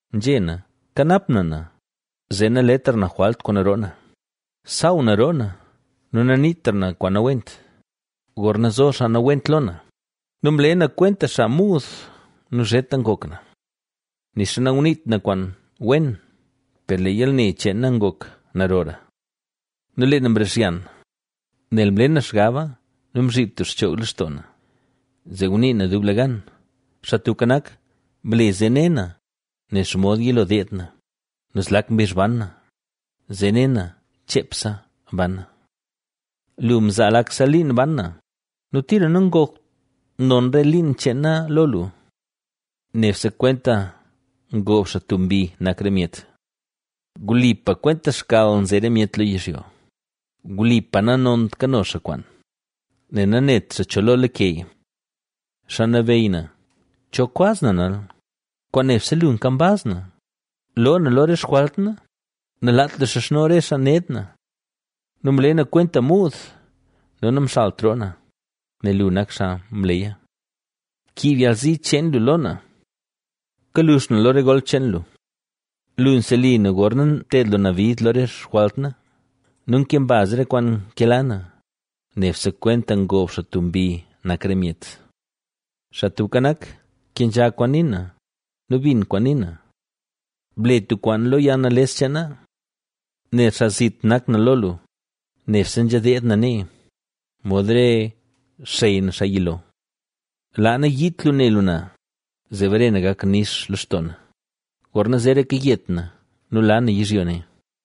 Nzhé na: Kanap na na, zee naletra na jwalt kwaan roo na; saaw na roo na nu naniitra na kwaan nawent, gorna zo xaa nawent lo na. Nu mle na kwenta xaa muud nu zheta ngok na. ¡Nixa nanguniit na kwaan wen! Per lee yalne cheen na ngok narora. Nu lee na mrixyan, Nel mle na xgaba nu mzhiib tub xchoog lextoo na, zee ngunii na dublegan: Xaa Tubka Nak, ble zee ne na, nen xomod yilo deed na nu zlak mbizh ban na, zee ne na cheepse ban na. Lu mzaa lakse liin ban na nu tira nangokt non re liin cheen na lo lu. ¡Nebse kwenta ngob xaa tub mbi nak re myet! Wlipa kwenta xkal nze re myet lo yizhyo, wlipa nanont kano xaa kwaan; nel nanet xaa cho lo lakeya. Xaa Nabeyy na, ¿cho kwaz na nal? ¡Kwaan nebse lu kambaz na! Loo na lo re xjwalt na; nalaat lu xizhno re xaa ned na. Mle na kwenta muud nu namxalt na roo na, nel lu nak xaa mleya. Kiib yalzi cheen lu lo na, kalux na lo re golp cheen lu. Lu nseli na gorna nted lu na bid lo re xjwalt na nu nke mbaz re kwaan nkela na, ¡Nebse kwenta ngob xaa tub mbi, nak re myet. Xaa Tubka Nak, kenzha kwaan nii na nu binn kwaan nii na. Ble tub kwaan lo yalnales cheen na. Nel xaa zit nak na lo lu, nebse nzha deed na nee, mod re xey na xaa yilo. Laa nayiit lu ne lu na, zee bare na gak nix lextoo na, gorna zeraka yet na nu la na yizhyo ne.